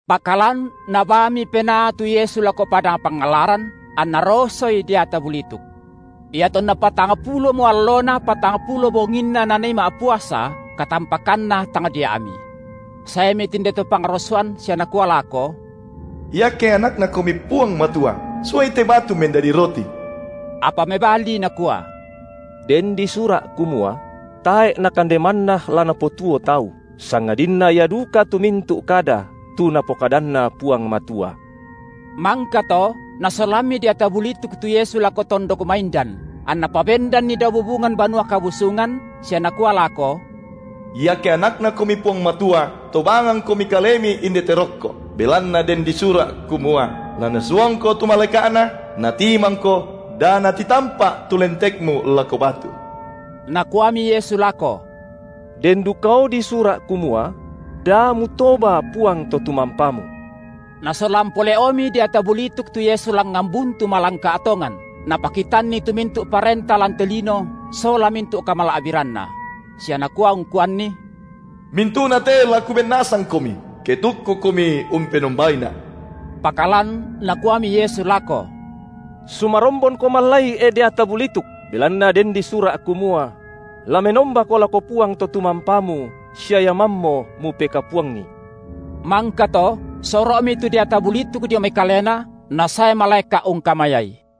Pakalan Nabaami Penaa tu Yesu lako padang pangallaran, anna rosoI deata bulituk. Iatonna patangpulomo allona patangpulo bonginna Nanii ma’puasa, katampakanna tangdia’mi. Saemi tinde to pangrosoan sia nakua lako: Iake AnakNaKomi Puang Matua, suai te batu mendadi roti. Apa mebali Nakua: Den disura’ kumua: Tae’ nakande manna la napotuo tau, sangadinna ia duka tu mintu’ kada, tu Napokadanna Puang Matua. Mangkato nasolammi deata bulituk tu Yesu lako tondok maindan, anna pabendanNi dao bubungan Banua Kabusungan, sia nakua lako: Iake AnakNaKomi Puang Matua, tobangangKomi Kalemi indete rokko, belanna den disura’, kumua: La NasuangKo tu malaeka’Na, natimangKo da natitampa’ tu lentekMu lako batu. Nakuami Yesu lako: Den dukao disura’ kumua: Da mutoba Puang Totumampamu. Nasolan pole’omi deata bulituk tu Yesu langngan buntu malangka’ tongan, napakitanNi tu mintu’ parenta lan te lino sola mintu’ kamala’biranna; sia nakua ungkuanNi: Mintu’nate la kuben nasangKomi, ke tukkuKomi umpenombaina’. Pakalan Nakuami Yesu lako: Sumarombonko mallai, e deata bulituk, belanna den disura’ kumua: La menombako lako Puang Totumampamu sia Ia mammo mupekapuangi. Mangkato soro’mi tu Deata bulituk dio mai Kalena, nasae malaeka’ ungkamayaI.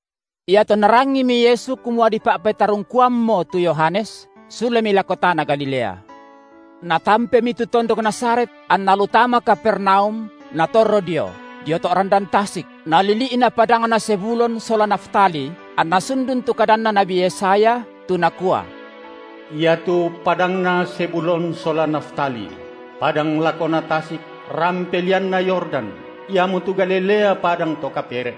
Iatonna rangimi Yesu kumua dipa’petarungkuammo tu Yohanes, sulemi lako tana Galilea. Natampemi tu tondok Nazaret anna lu tama Kapernaum natorro dio, dio to’ randan tasik, nalili’na padangna Zebulon sola Naftali, anna sundun tu kadanna nabi Yesaya, tu nakua: Iatu padangna Zebulon sola Naftali, padang lakona tasik, rampe lianna Yordan, iamotu Galilea padang to kapere’;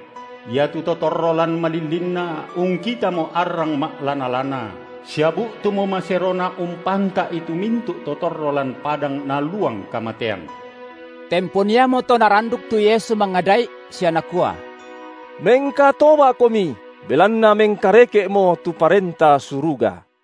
iatu to torro lan malillinna ungkitamo arrang ma’lana-lana, sia bu’tumo maserona umpanta’i tu mintu’ to torro lan padang naluang kamatean. Tempon iamoto naranduk tu Yesu mangada’i sia nakua: Mengkatoba’komi belanna mengkareke’mo tu Parenta Suruga.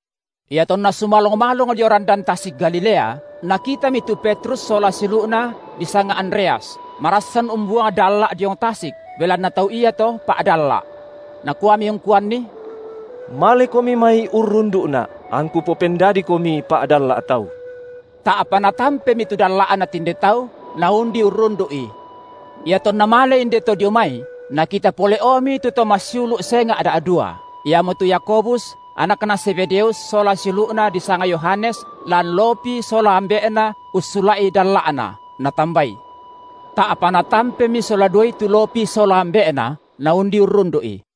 Iatonna sumalong-malong dio randan tasik Galilea, Nakitami tu Petrus sola siulu’na disanga Andreas, marassan umbuang dalla’ diong tasik, belanna tau iato pa’dalla’. Nakuami ungkuanni: Malekomi mai urrundu’Na’ angKu popendadikomi pa’dalla’ tau. Ta’pa natampemi tu dalla’na tinde tau, naundi urrundu’I. Iatonna male inde to dio mai, Nakita pole’omi tu to massiulu’ senga’ da’dua, iamotu Yakobus, anakna Zebedeus sola siulu’na disanga Yohanes lan lopi sola ambe’na ussula’i dalla’na, Natambai. Ta’pa natampemi sola duai tu lopi sola ambe’na, naundi urrundu’I.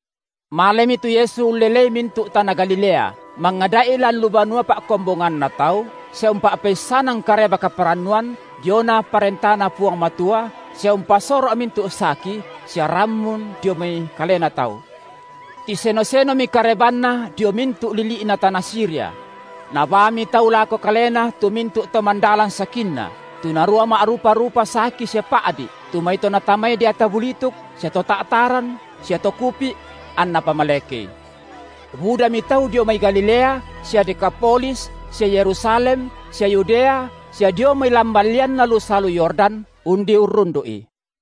Malemi tu Yesu ullelei mintu’ tana Galilea mangada’i lan lu banua pa’kombonganna tau, sia umpa’peissanan Kareba kaparannuan diona ParentaNa Puang Matua sia umpasoro’ mintu’ saki sia rammun dio mai kalena tau. Tiseno-senomi karebanNa dio mintu’ lili’na tana Siria; nabaami tau lako Kalena tu mintu’ to mandalan sakinna, tu narua ma’rupa-rupa saki sia pa’di’, tu mai to natamai deata bulituk sia to ta’taran sia to kupi’; anNa pamalekei. Budami tau dio mai Galilea sia Dekapolis sia Yerusalem sia Yudea sia dio mai lamban lianna salu Yordan undi urrundu’I.